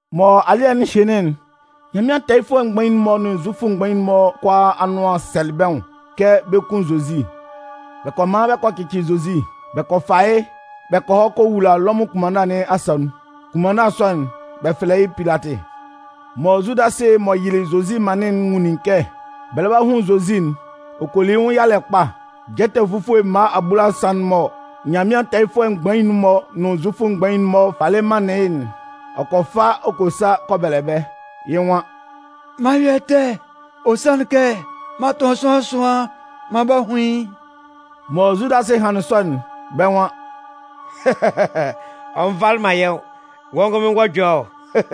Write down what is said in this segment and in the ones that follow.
Mɔ alɩ́ɛ'n hɩnlɩn'n, Nyanmɩan tɛɛyɩfʋɛ mgbain'n-mɔ nʋn Zufʋ mgbain'n-mɔ kʋalaa anʋan sɛlɩ bɛ́ nwʋn kɛ bɛ 'kun Zozi. Bɛ kɔ man bɛ kɔ cɩcɩ Zozi. Bɛ kɔ fa yɩ́ bɛ kɔ hɔ kɔ wula Lɔmʋn kʋnmanna nɩn asa nun. Kʋnmanna sɔ'n, bɛ fɛlɛ yɩ́ Pilatɩ. Mɔ Zudasɩ m'ɔ yɩlɩ Zozi manlɩn'n nwunlin kɛ bɛ lɛ ba hun Zozi'n, ɔ kɔ li yɩ́ nwʋn yalɛ kpa. Jɛtɛ fufue mma abulasan'n mɔ Nyanmɩan tɛɛyɩfʋɛ mgbain'n-mɔ nʋn Zufʋ mgbain'n-mɔ falɩ manlɩn yɩ́'n, ɔ kɔ fa ɔ kɔ sa kɔ bɛlɛ bɛ́. Yɩ́ nwan: “M'an yɔ ɛtɛ, ɔ sanlɩn kɛ m'an tʋn sʋanlan ɛsʋan maan b'a hun yɩ́.” Mɔ Zudasɩ hanlɩn sɔ'n, bɛ́ nwan: “Ɔ nvalɩ man yɛ́ nwʋn. Wɔ́ ngʋnmɩn wɔ́ ɛjɔlɛ ɔ!”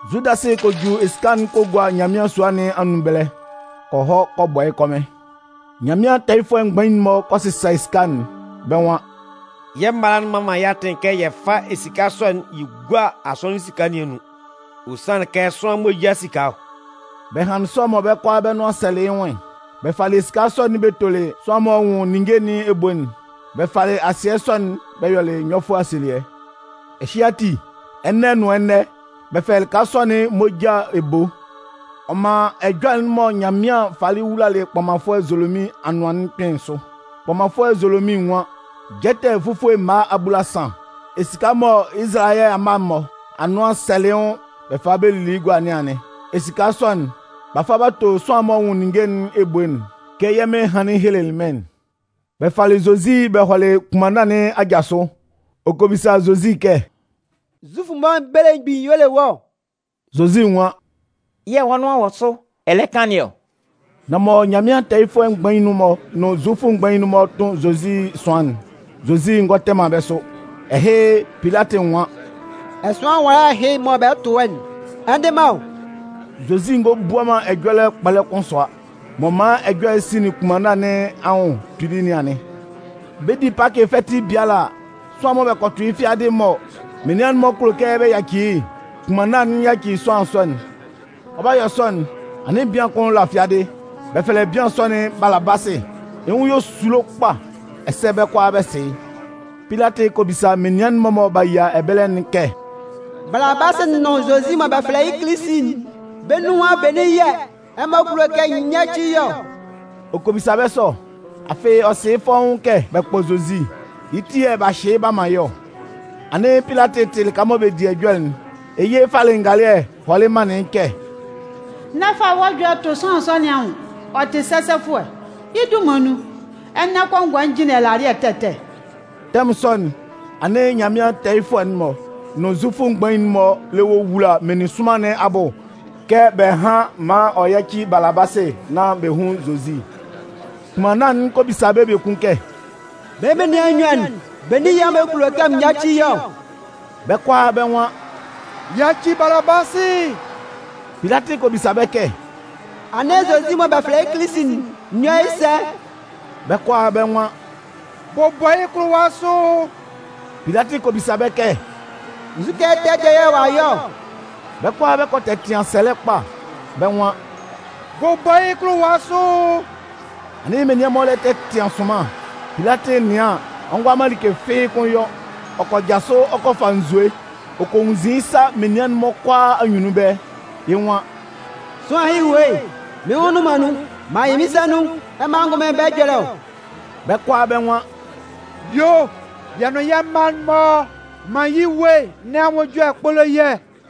Zudasɩ kɔ ju esika'n kɔ gua Nyanmɩan sua nɩn anun ɛbɛlɛ ɔ kɔ hɔ kɔ bɔ yɩ́ kɔmɩn. Nyanmɩan tɛɛyɩfʋɛ mgbain'n-mɔ kɔ sɩsa esika'n. Bɛ́ nwan: “Yɛ́ mala'n mman man yɛ́ atɩn kɛ yɛ fá esika sɔ'n yɛ gúa asɔnɩn esika nɩn anun. Ɔ sanlɩn kɛ sʋanlan moja esika ɔ.” Bɛ hanlɩn sɔ mɔ bɛ́ kʋalaa bɛ́ nʋan sɛlɩ yɩ́ nwʋn'n, bɛ falɩ esika sɔ'n bɛ tolɩ sʋanlan'n m'ɔ nwʋn ninnge nɩn ebo'n. Bɛ falɩ asɩɛ sɔ'n bɛ yɔlɩ nyɔfʋɛ asielɩɛ. Ɛhɩ ati, ɛnɛ nʋn ɛnɛ, bɛ tɛ fɛlɛ lɩka sɔ'n “Moja Ebo”. Ɔ man ɛjɔlɛ'n mɔ Nyanmɩan falɩ wulalɩ kpɔmanfʋɛ Zolomin anʋan'n kpɩnlɩn sʋ. Kpɔmanfʋɛ Zolomin nwan: Jɛtɛ fufue mma abulasan, esika mɔ Izalayɛ amma'n-mɔ anʋan sɛlɩ yɩ́ nwʋn bɛ falɩ bɛ lili yɩ́ gua nɩn anɩn. Esika sɔ'n b'a fa b'a to sʋanlan'n m'ɔ nwʋn ninnge nɩn ebo'n kɛ yɛ́ Mɩn hanlɩn helelɩ mɩ́n'n. Bɛ falɩ Zozi bɛ hɔlɩ kʋnmanna nɩn aja sʋ. Ɔ kɔ bisa Zozi kɛ: “Zufʋ'n-mɔ belemgbin'n y'ɔ le wɔ́ ɔ?” Zozi nwan: “Yɛ̂ wɔ́ nʋan wɔ sʋ ɛ lɛ kan nɩn ɔ.” Nan mɔ Nyanmɩan tɛɛyɩfʋɛ mgbain'n-mɔ nʋn Zufʋ mgbain'n-mɔ 'tʋn Zozi ɛsʋan'n, Zozi ngɔ tɛ man bɛ́ sʋ. Ɛhɩ, Pilatɩ nwan: “Ɛsʋan nwala ɛhɩ mɔ bɛ lɛ tʋn wɔ́'n, ɛ ndɩ man ɔ?” Zozi ngɔ bua ɛjɔlɛ kpɔlɛ kʋn sʋa. M'ɔ man ɛjɔlɛ'n sinlin kʋnmanna nɩn anwʋn kpili nɩn anɩn. Bɛ 'di Pakɩ fɛtɩ biala a, sʋanlan mɔ bɛ kɔ tʋ yɩ́ fiadɩ mɔ menian'n-mɔ kulo kɛ bɛ yaci yɩ́'n, kʋnmanna'n yaci sʋanlan sɔ'n. Ɔ 'ba yɔ sɔ'n, anɩn bian kʋn la fiadɩ. Bɛ fɛlɛ bian sɔ'n Balabasɩ. Yɩ́ nwʋn yɔ esulo kpa, ɛsɛ bɛ́ kʋalaa bɛ sɩ yɩ́. Pilatɩ kɔ bisa menian'n-mɔ mɔ b'a yia ɛbɛlɛ'n kɛ: “Balabasɩ nʋn Zozi mɔ bɛ fɛlɛ yɩ́ Kilisi'n, bɛ́ nunhan benin yɛ̂ ɛmɔ kulo kɛ n yáci yɩ́ ɔ?” Ɔ kɔ bisa bɛ́ sɔ, afɩ ɔ sɩ yɩ́ fɔ́ʋ́n kɛ bɛ kpɔ Zozi, yɩ́ ti yɛ̂ b'a hyɩ yɩ́ b'a man yɩ́ ɔ. Anɩn Pilatɩ tɩ lɩka mɔ bɛ di ɛjɔlɛ'n, yɩ́ yɩ falɩ ngalɩɛ hɔlɩ manlɩn yɩ́ kɛ: “N'ɛ fa wɔ́ ɛjɔlɛ tʋ sʋanlan sɔ nɩn anwʋn, ɔ tɩ sɛsɛfʋɛ. Yɩ́ dunman nun, ɛnɛ kɔngɔɛ n jɩnlɩn ɛlalɩɛ ɛtɛ ɛtɛ.” Tɛmʋn sɔ'n, anɩn Nyanmɩan tɛɛyɩfʋɛ mgbain'n-mɔ nʋn Zufʋ mgbain'n-mɔ lɛ wowula meninsʋnman nɩn abʋ kɛ bɛ hán maan ɔ yáci Balabasɩ nán bɛ hún Zozi. Kʋnmanna'n kɔ bisa bɛ́ biekun kɛ: “Bɛ́ menian nnyuan'n, benin yɛ̂ ɛmɔ kulo kɛ n yáci yɩ́ ɔ?” Bɛ́ kʋalaa bɛ́ nwan: “Yaci Balabasɩ!” Pilatɩ kɔ bisa bɛ́ kɛ: “Anɩn Zozi mɔ bɛ fɛlɛ yɩ́ Kilisi'n, n yɔ́ yɩ́ sɛ?” Bɛ́ kʋalaa bɛ́ nwan: “Bʋbɔ yɩ́ kʋlʋwa sʋ!” Pilatɩ kɔ bisa bɛ́ kɛ: “Nzukɛ ɛtɛ dɩɛ yɛ̂ ɔ'a yɔ ɔ?” Bɛ́ kʋalaa bɛ kɔ tɛtɩan sɛlɛ kpa bɛ́ nwan: “Bʋbɔ yɩ́ kʋlʋwa sʋ!” Anɩn menian'n-mɔ lɛ tɛtɩan sʋnman. Pilatɩ nɩan an, ɔ ngʋala man like fɩ́ɩ́ kʋ́n yɔ. Ɔ kɔ jasʋ ɔ kɔ fa nzue ɔ kɔ nwunnzin yɩ́ sa menian'n-mɔ kʋalaa anyunnun ɛbɛlɛ. Yɩ́ nwan: “Sʋanlan ɛhɩ ewue'n, mɩ́n nwʋn nnʋn man nun, m'an yɩ mɩ́n sa nun! Ɛmɔ angʋnmɩn, bɛ́ ɛjɔlɛ ɔ!” Bɛ́ kʋalaa bɛ́ nwan: “Yuo o! Yɛ́ nʋn yɛ́ mma'n-mɔ, man yɩ́ ewue nɩn anwʋn ɛjɔlɛ kpólo yɛ́!”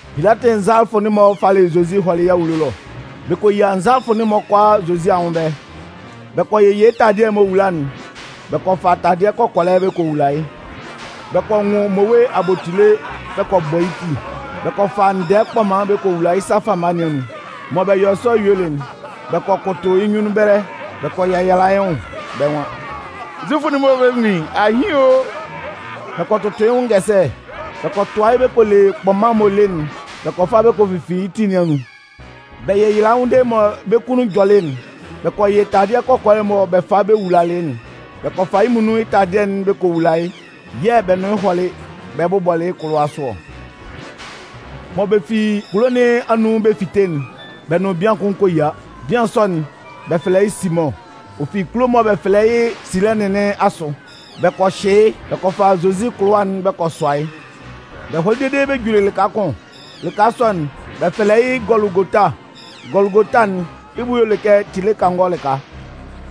Pilatɩ nzalafʋ'n-mɔ falɩ Zozi hɔlɩ yɩ́ awulo ɛlɔ. Bɛ kɔ yia nzalafʋɛ'n-mɔ kʋalaa Zozi anwʋn ɛbɛlɛ. Bɛ kɔ yɩ yɩ́ taladɩɛ'n m'ɔ wula'n, bɛ kɔ fa taladɩɛ kɔkɔlɛ bɛ kɔ wula yɩ́. Bɛ kɔ nwʋn mmowe abotile bɛ kɔ bɔ yɩ́ ti. Bɛ kɔ fa ndɛɛ kpɔman bɛ kɔ wula yɩ́ sa fama nɩn anun. Mɔ bɛ yɔlɩ sɔ yuelɩ'n, bɛ kɔ kʋtʋ yɩ́ nyunnun ɛbɛlɛ bɛ kɔ yɛyala yɩ́ nwʋn. Bɛ́ nwan: “Zufʋ'n-mɔ belemgbin, ahɩn o!” Bɛ kɔ tʋtʋ yɩ́ nwʋn ngɛsɛlɛ. Bɛ kɔ tʋa yɩ́ bɛ kɔ le kpɔman'n m'ɔ le'n bɛ kɔ fa bɛ kɔ fifin yɩ́ tin nɩn anun. Bɛ yɛyalalɩ yɩ́ nwʋn dede mɔ bɛ́ kunnun jɔlɩ'n, bɛ kɔ yɩ́ taladɩɛ kɔkɔlɛ'n mɔ bɛ falɩ bɛ wulalɩ yɩ́'n. Bɛ kɔ fa yɩ́ muonun yɩ́ taladɩɛ dɩɛ'n bɛ kɔ wula yɩ́ yɛ̂ bɛ nʋn yɩ́ hɔlɩ bɛ bʋbɔlɩ yɩ́ kʋlʋwa sʋ ɔ. Mɔ bɛ fi kulo nɩn anun bɛ 'fite'n, bɛ nʋn bian kʋn kɔ yia. Bian sɔ'n, bɛ fɛlɛ yɩ́ Simʋn. Ɔ fi kulo'n mɔ bɛ fɛlɛ yɩ́ Silɛnɩn nɩn asʋ. Bɛ kɔ hyɩ yɩ́ bɛ kɔ fa Zozi kʋlʋwa'n bɛ kɔ sʋa yɩ́. Bɛ hɔlɩ dede bɛ juli lɩka kʋn. Lɩka sɔ'n, bɛ fɛlɛ yɩ́ Gɔlʋgota. Gɔlʋgota'n, yɩ́ bʋ y'ɔ le kɛ tile kangɔ lɩka.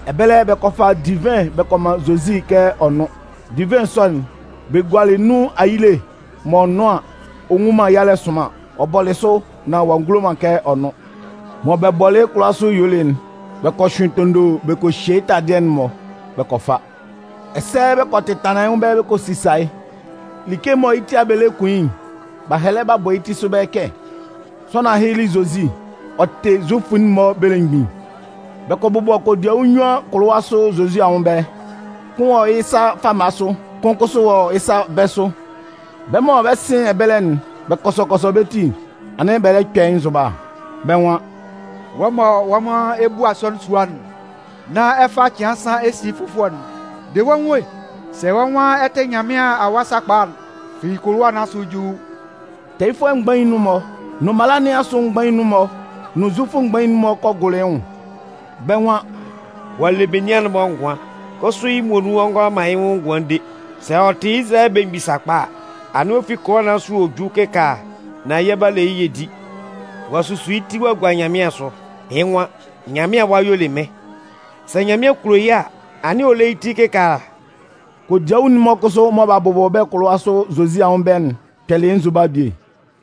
Ɛbɛlɛ, bɛ kɔ fa divɩn bɛ kɔ man Zozi kɛ ɔ nʋ́n. Divɩn sɔ'n, bɛ gualɩ nun ayile m'ɔ nʋn an, ɔ nnwun man yalɛ'n sʋnman. Ɔ bɔlɩ sʋ, nan ɔ'a ngulo kɛ ɔ nʋn. Mɔ bɛ bʋbɔlɩ yɩ́ kʋlʋwa nɩn asʋ yuelɩ'n, bɛ kɔ hyʋɩn tondo bɛ kɔ hye yɩ́ taladɩɛ'n-mɔ bɛ kɔ fa. Ɛsɛ bɛ kɔ tɛtanlan yɩ́ nwʋn ɛbɛlɛ bɛ kɔ sisa yɩ́. Like mɔ yɩ́ ti yɛ̂ bɛ lɛ kun yɩ́'n, b'a hɛlɛ b'a bɔ yɩ́ ti sʋ ɛbɛlɛ kɛ: “Sʋanlan ɛhɩ li Zozi. Ɔ tɩ Zufʋ'n-mɔ belemgbin.” Bɛ kɔ bʋbɔ kodiawu nnyuan kʋsʋ kʋlʋwa sʋ Zozi anwʋn ɛbɛlɛ. Kʋn wɔ yɩ́ sa fama sʋ yɛ̂ kʋn kʋsʋ wɔ yɩ́ sa bɛ̂ sʋ. Bɛ́ mɔ bɛ 'sɩn ɛbɛlɛ'n, bɛ kɔsɔ kɔsɔ bɛ́ ti, anɩn bɛ lɛ kpɛ yɩ́ nzʋba. Bɛ́ nwan: “Wɔ́ mɔ wɔ́ nwan ɛ 'bu asɔnɩn sua'n, nán ɛ fa cɩan nsan ɛ si yɩ́ fʋfɔlɛ'n, de wɔ́ nwʋn e! Sɛ wɔ́ nwan ɛ tɩ Nyanmɩan Awa sakpa a, fi kʋlʋwa nɩn asʋ ju!” Tɛɛyɩfʋɛ mgbain'n-mɔ, nʋn mala nɩn asʋ mgbain'n-mɔ nʋn Zufʋ mgbain'n-mɔ kʋsʋ kɔ gʋlʋ yɩ́ nwʋn. Bɛ́ nwan: “Ɔ'a le menian'n-mɔ ngʋan, kʋsʋ yɩ́ muonun ɔ ngʋala man yɩ́ nwʋn ngʋan de! Sɛ ɔ tɩ Izalayɛ belemgbin sakpa a, anɩn ɔ fi kʋlʋwa nɩn asʋ ɔ jú kɩkaala, nán yɛ 'ba le yɩ́ yɛ di. Ɔ'a susu yɩ́ ti ɔ'a gua Nyanmɩan asʋ. Yɩ́ nwan: ‘Nyanmɩan Awa y'ɔ le mɩ́n’. Sɛ Nyanmɩan kulo yɩ́ a, anɩn ɔ lé yɩ́ ti kɩkaala!” Kodiawu'n-mɔ kʋsʋ mɔ b'a bʋbɔ bɛ́ kʋlʋwa sʋ Zozi anwʋn ɛbɛlɛ'n kpɛlɩ yɩ́ nzʋba bie.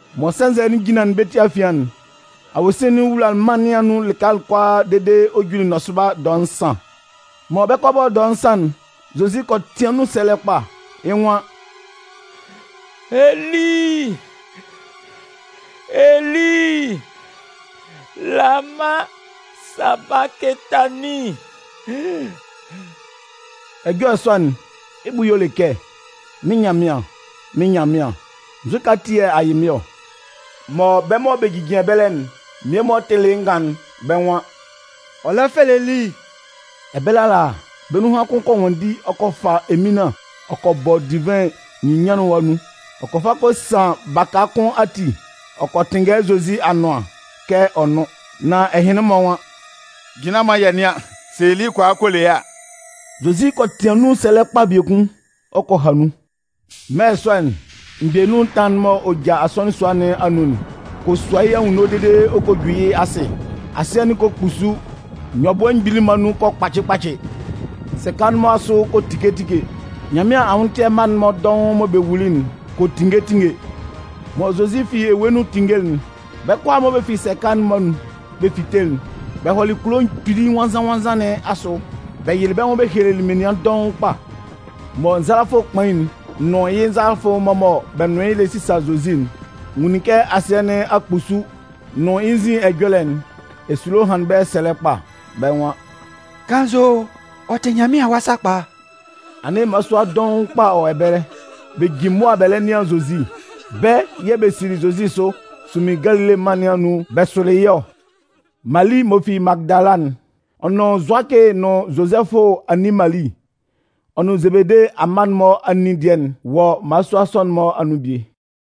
Mɔ sɛnzɛ'n jinlanlɩn bɛ́ ti afian'n, awosin wulalɩ mân nɩn anun lɩka kʋalaa dede ɔ juli nɔsʋba dɔɛ nsan. Mɔ bɛ 'kɔ a bɔ dɔɛ nsan'n, Zozi kɔ tɩan nun sɛlɛ kpa. Yɩ́ nwan: “Eli, Eli, lama sabakɩtanin?” Ɛjɔlɛ sɔ'n, yɩ́ bʋ y'ɔ le kɛ “Mɩ́n Nyanmɩan, mɩ́n Nyanmɩan, nzukɛ ati yɛ̂ a yɩ mɩ́n ɔ?” Mɔ bɛ́ mɔ bɛ jijin ɛbɛlɛ'n mmie-mɔ tɩlɩ yɩ́ ngan'n, bɛ́ nwan: “Ɔ lɛ fɛlɛ Eli!” Ɛbɛlɛ ala, bɛ́ nunhan kʋn kɔ nwanndi ɔ kɔ hɔ kɔ fa eminlan ɔ kɔ bɔ divɩn nyinnyanlɩnwa anun. Ɔ kɔ fa kɔ san baka kʋn ati ɔ kɔ tɩnngɛ yɩ́ Zozi anʋan kɛ ɔ nʋ́n. Nan ɛhɩnlɩn-mɔ nwan: “Jinlan maan yɛ nɩ́an sɛ Eli kɔ a kɔ le yɩ́ a!” Zozi kɔ tɩan nun sɛlɛ kpa biekun, ɔ kɔ ha nun. Mɛlɛ sɔ'n, mgbɛnun ɛtanlan'n m'ɔ ja asɔnɩn sua nɩn anun'n kɔ sua yɩ́ anwunno dede ɔ kɔ ju yɩ́ asɩ. Asɩɛ'n kɔ kpusu, nyɔbʋɛ mgbili'n-mɔ anun kɔ kpacɩ kpacɩ. Sɛka'n-mɔ asʋ kɔ tike tike. Nyanmɩan anwʋntɩɛ mma'n-mɔ dɔʋn mɔ bɛ wuli'n kɔ tinnge tinnge. Mɔ Zozi fi ewue nun tinngelɩ'n, bɛ́ kʋalaa mɔ bɛ fi sɛka'n-mɔ anun bɛ fitelɩ'n, bɛ hɔlɩ kulo kpili nwannzan-nwannzan nɩn asʋ bɛ yɩlɩ bɛ́ nwʋn bɛ helelɩ menian dɔʋn kpa. Mɔ nzalafʋ kpain'n nʋn yɩ́ nzalafʋ'n-mɔ mɔ bɛ́ nʋn yɩ́ lɛ sisa Zozi'n nwunlin kɛ asɩɛ nɩn a kpusu nʋn yɩ́ nzin ɛjɔlɛ'n, esulo hanlɩn bɛ́ sɛlɛ kpa. Bɛ́ nwan: “Kannzʋ ɔ tɩ Nyanmɩan Awa sakpa!” Anɩn mmalasua dɔʋn kpa kʋsʋ wɔ ɛbɛlɛ, bɛ jin mʋa bɛ lɛ nɩan Zozi. Bɛ́ yɛ̂ bɛ sili Zozi sʋ sunmin Galile mân nɩn anun bɛ sʋlɩ yɩ́ ɔ. Mali m'ɔ fi Magɩdala'n, ɔ nʋn Zʋakɩ nʋn Zozɛfʋ anin Mali, ɔ nʋn Zebede amma'n-mɔ anin dɩɛ'n wɔ mmalasua sɔ'n-mɔ anun bie.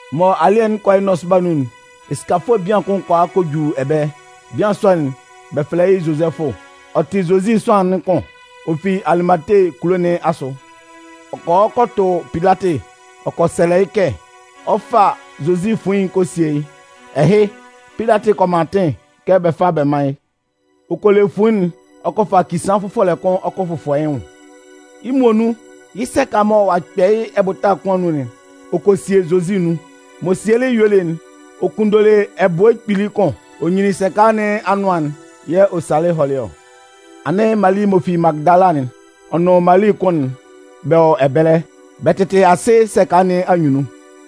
Mɔ alɩ́ɛ'n 'kɔ yɩ́ nɔsʋba nun'n, esikafʋɛ bian kʋn kɔ a kɔ ju ɛbɛlɛ. Bian sɔ'n, bɛ fɛlɛ yɩ́ Zozɛfʋ, ɔ tɩ Zozi sʋanlan'n kʋn. Ɔ fi Alimate kulo nɩn asʋ. Ɔ kɔ hɔ kɔ tʋ Pilatɩ ɔ kɔ sɛlɛ yɩ́ kɛ ɔ 'fa Zozi fuin'n ɔ 'kɔ a sie yɩ́. Ɛhɩ, Pilatɩ kɔ man atɩn kɛ bɛ fá bɛ mán yɩ́. Ɔ kɔ le fuin'n ɔ kɔ fa kisaan fʋfɔlɛ kʋn ɔ kɔ fʋfɔ yɩ́ nwʋn. Yɩ́ muonun yɩ́ sɛka mɔ ɔ'a man b'a kpɛ yɩ́ ɛbʋta kʋn anun'n, ɔ kɔ sie Zozi nun. M'ɔ sielɩ yɩ́ yuelɩ'n, ɔ kunndolɩ ɛbʋɛ kpili kʋn ɔ nyinlin sɛka nɩn anʋan'n yɛ̂ ɔ salɩ hɔlɩ ɔ. Anɩn Mali m'ɔ fi Magɩdala'n, ɔ nʋn Mali kʋn'n bɛ wɔ ɛbɛlɛ. Bɛ tɩtɩ asɩ sɛka nɩn anyunnun.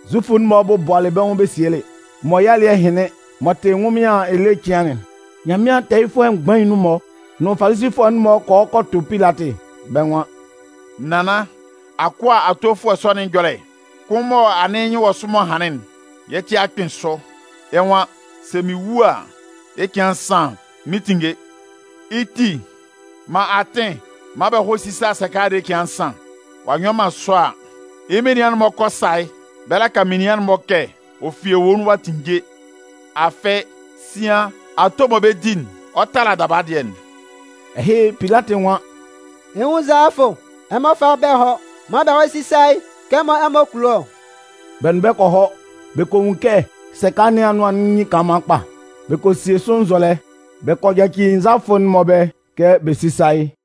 Zufʋ'n-mɔ bɔbʋalɩ bɛ́ nwʋn bɛ sielɩ. Mɔ yɩ́ alɩ́ɛ hɩnlɩn m'ɔ tɩ ɛnwʋnmɩan ele cɩan'n, Nyanmɩan tɛɛyɩfʋɛ mgbain'n-mɔ nʋn Falisifʋɛ'n-mɔ kɔ hɔ kɔ tʋ Pilatɩ. Bɛ́ nwan: “Nannan, akʋa atofʋɛ sɔ nɩn ɛjɔlɛ kʋn mɔ anɩn yɩ́ nyɩn wɔ sʋ m'ɔ hanlɩn'n, yɛ́ ti a kpɩn sʋ. Yɩ́ nwan: ‘Sɛ mɩn wu a, yɩ́ cɩan nsan, mɩn 'tinnge.’ Yɩ́ ti, man atɩn maan bɛ hɔ́ sísa sɛka'n dede cɩan nsan. Ɔ'a nyɔ man sɔ a, yɩ́ menian'n-mɔ 'kɔ a sa yɩ́ bɛ laka menian'n-mɔ kɛ: ‘Ɔ fi ewue nun ɔ'a tinnge!’ Afɩ, sian ato mɔ bɛ 'di'n, ɔ 'tala daba dɩɛ'n.” Ɛhɩ, Pilatɩ nwan: “Ɛ 'nwun nzalafʋ, Ɛmɔ fá bɛ́ hɔ́, maan bɛ hɔ́ sísa yɩ́ kɛ mɔ ɛmɔ kulo ɔ.” Bɛ nʋn bɛ́ kɔ hɔ, bɛ kɔ nwun kɛ sɛka nɩn anʋan'n nyin kanlanman kpa. Bɛ kɔ sie sʋ nzɔlɛ, bɛ kɔ yaci nzalafʋ'n-mɔ ɛbɛlɛ kɛ bɛ sísa yɩ́.